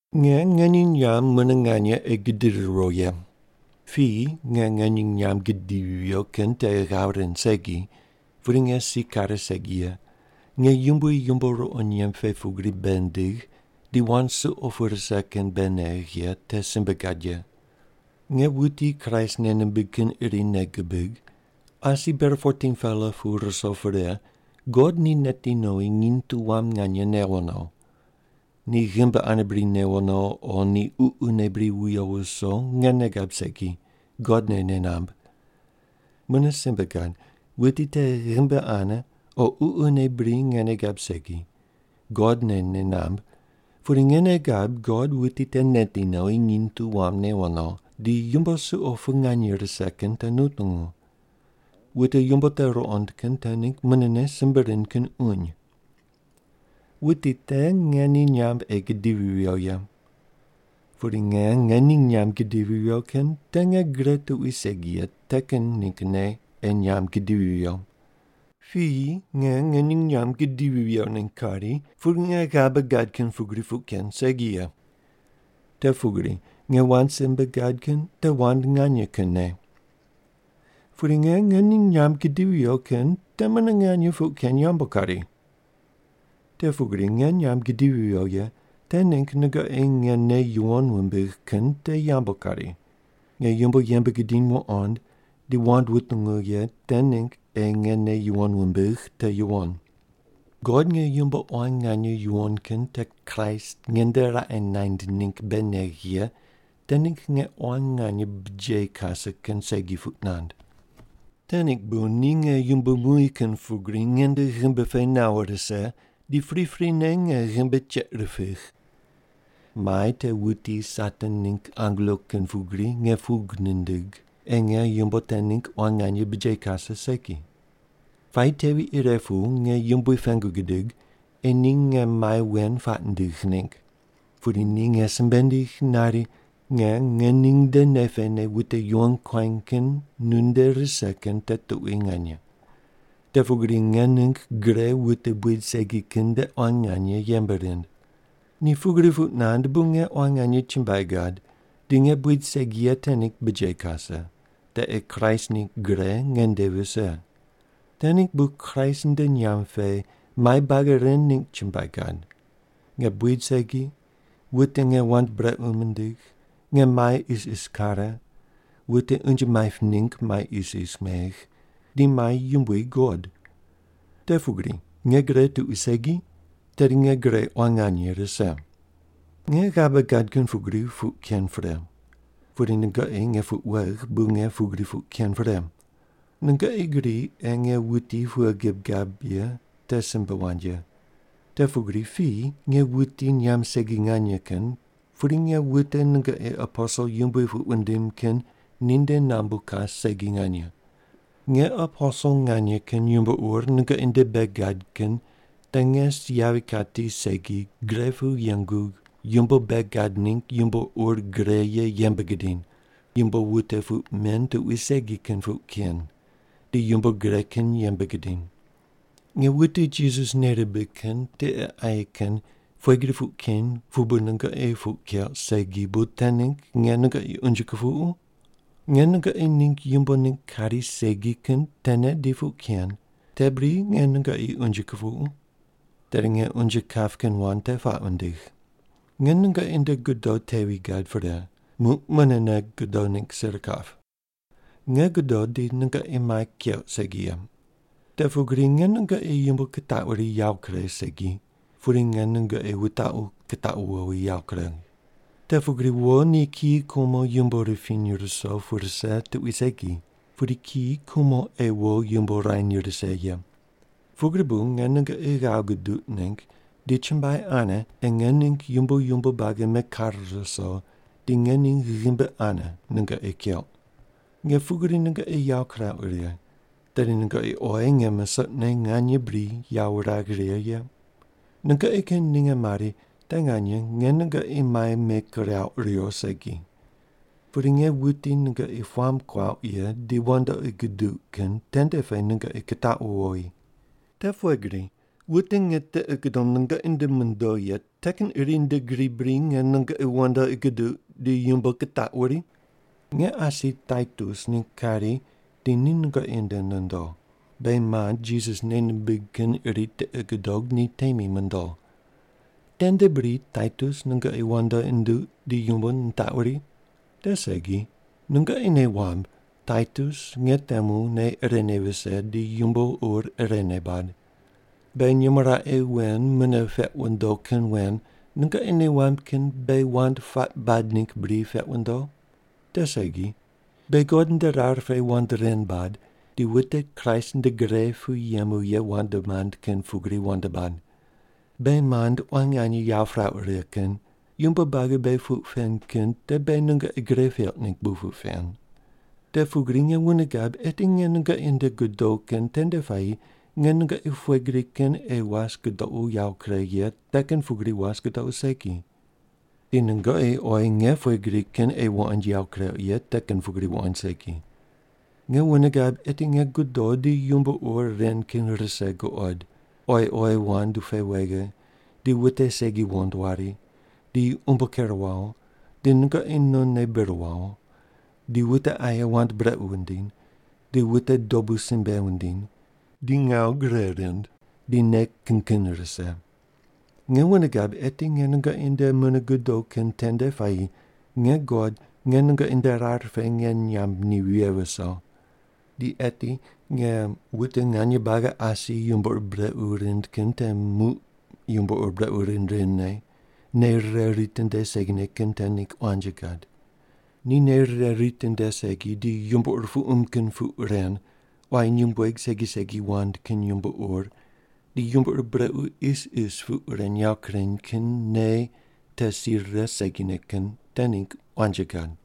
Nge ngening nyamb mune nganye ei gidiri riwo ye. Piyi nge ngening nyamb gidivi viyo kin te ghav rind segi, pudi nge si kare segi ye, nge Yumbui yumbo ruqo nyemb pe pugri bei nindigh di wand suqo pu rise kin bei negh ye te simbe gad ye. Nge wuti Kraist nei nimbig kin iri nei gibig, asi ber 14-pela pu ruso pre God ni neti nowi nginy tu wam nganye newo no. Ni ghimbi ane bri newo no o ni ququne bri wuyo wuso nge nei gab segi, God ne nei namb. Mune simbe gad, wuti te ghimbi ane o ququne bri nge nei gab segi, God ne nei namb, pudi nge nei gab God wuti te neti nowi, nginy tu wam newo no, di yumbo suqo pu nganye rise kin te nutungu. Wute yumbo te ruqond kin te ningg munene simbe rind kin uny. Wuti te nge ni nyamb ei gidivi viyo ye. Pudi nge ngening nyamb gidivi viyo kin te nge gre tuqui segi ye te kin ninggne ei nyamb gidivi viyo. Piyi nge ngening nyamb gidivi viyo ningg kari, pudi nge ghabe gad kin pugri puq ken segi ye. Te pugri nge wand simbe gad kin te wand nganye kinne. Pudi nge ngening nyamb gidivi viyo kin te mune nganye puq ken yambu kari. Te pugri nge nyamb gidivi viyo ye te ningg nungoqi nge nei yuwon wumbigh kin te yambu kari, nge yumbo yembe gidiny wuqond di wand wutungu ye te ningg ei nge nei yuwon wumbigh te yuwon. God nge yumbo quan nganye yuwon kin te Kraist nge nde raqe naind ningg bei negh ye te ningg nge quan nganye bujeyi kase kin segi puq nand. Te ningg bu ni nge yumbo muy kin pugri nge nde ghimbi pe nawo rise di priprine nge ghimbi cheiq ripigh. Mai te wuti Satan ningg angelo kin pugri nge pug nindigh ei nge yumbo te ningg quan nganye bujeyi kase segi. Puayi tevi ire pu nge Yumbui pengu gidig ei ni nge mai wen puaq nindigh ningg. Pudi ni nge simbe nindigh nari, “Nge ngening nde nei pene wute yuwon kuany kin nunde rise kin te tuqui nganye. Te pugri nge ningg gre wute buid segi kin nde quan nganye yembe rind.” Ni pugri puq nand bu nge quan nganye chumbuai gad di nge buid segi ye te ningg bujeyi kase, te ei Kraist ningg gre nge nde vise. Te ningg bu Kraist nde nyamb pe mai buagi ren ningg chumbuai gad: nge buid segi, wute nge wand brequ mindigh, nge mai isis kare, wute unje maip ningg mai isis megh, di mai yumbui guqod. Te pugri nge gre tuqui segi, tedi nge gre quan nganye rise. Nge ghabe gad kin pugri puq ken pre. Pudi nungoqi nge puq wegh bu nge pugri puq ken pre. Nungoqi gri ei nge wuti pughe gib gab ye te simbe wand ye. Te pugri piyi nge wuti nyamb segi nganye kin, pudi nge wute nungoqi “aposel yumbui” puq wundim kin ni nde nambu kas segi nganye. Nge aposel nganye kin yumbo ur nungoqi nde bei gad kin te nge si yavi kati segi gre pu yengu yumbo bei gad ningg yumbo ur gre ye yembe gidiny, yumbo wute puq men tuqui segi kin puq ken, di yumbo gre kin yembe gidiny. Nge wute Jisas nei rimbig kin tiqe aye kin pughe gri puq keny pu bu nungoqi puq keuq segi bu te ningg nge nungoqi unje kupuqu? Nge nungoqi ningg yumbo ningg kari segi kin tene di puq ken, te bri nge nungoqi unje kupuqu? Tedi nge unje kap kin wand te puaq wundigh. Nge nungoqi nde godo tevi gad pre, muq munene godo ningg sir kap. Nge godo di nungoqi mai keuq segi ye. Te pugri nge nungoqi yumbo kitaquri yawo kuregh segi, pudi nge nungoqi wutaqu kitaqu wowi yawo kuregh. Te pugri wo ni kiyi kumo yumbo ripiny ruso pu rise tuqui segi, pudi kiyi kumo ei wo yumbo ruany rise ye. Pugri bu nge nungoqi ghav guduq ningg di chumbuai ane ei nge ningg yumbo yumbo buagi mekare ruso di ngening ghimbi ane nungoqi keuq. Nge pugri nungoqi yawo kirauq righe, tedi nungoqi oyi nge musoqne nganye bri yawo wuragh righe ye? Nungoqi kin ninge mari te nganye nge nungoqi mai mekirauq riwo segi. Pudi nge wuti nungoqi puamb kuauq ye di wandoqi guduq kin tende pe nungoqi kitaqu wowi. Te pughe gri, wute nge tiqi gudom nungoqi nde mondo ye te kin iri nde gri bri nge nungoqi wandoqi guduq di yumbo kitaquri? Nge asi Taitus ningg kari di ni nungoqi nde nondo, beghi mand Jisas nei nimbig kin iri tiqi gudog ni temi mondo. Tende bri Taitus nungoqi wandoqi nunduq di yumbo nitaquri? Te segi. Nungoqi nei wamb Taitus nge temu nei irene vise di yumbo ur irene bad. Beghi nyumo raqe wen mune peq wundo kin wen nungoqi nei wamb kin beghi wand puaq bad ningg bri peq wundo? Te segi. Beghi God nde rar pe wand ren bad, di wute Kraist nde gre pu yemu ye wand mand kin pugri wand bad. Beghi mand quan nganye yawo pirauq righe kin, yumbo buagi beghi puq pen kin te beghi nungoqi gre peuq ningg bu puq pen. Te pugri nge wune gab eti nge nungoqi nde godo kin tende puayi nge nungoqi pughe gri kin ei was gudoqu yawo kuregh ye te kin pugri was gudoqu segi. Di nungoqi oyi nge pughe gri kin ei wuqoind yawo kureuq ye te kin pugri wuqoind segi. Nge wune gab eti nge godo di yumbo ur ren kin rise guqod: Oyi oyi wand pe wege, di wute segi wuqond wari, di umbo ker wawo, di nungoqi nonne bir wawo, di wute aye wand brequ wundiny, di wute dobu simbe wundiny, di ngawu gre rind, di nei kin kin rise. Nge wune gab eti nge nungoqi nde mune godo kin tende puayi nge God nge nungoqi nde rar pe nge nyamb ni vighe viso. Di eti nge wute nganye buagi asi yumbo ur brequ rind kin te muq yumbo ur brequ rind rindne, nei rire ritinde segine kin te ningg quanji gad. Ni nei rire ritinde segi, di yumbo ur puqum kin puq ren, quayi nyumbueg segi segi wand kin yumbo ur, di yumbo ur brequ isis puq ren yawo kureny kin nei te si rire segine kin te ningg quanji gad.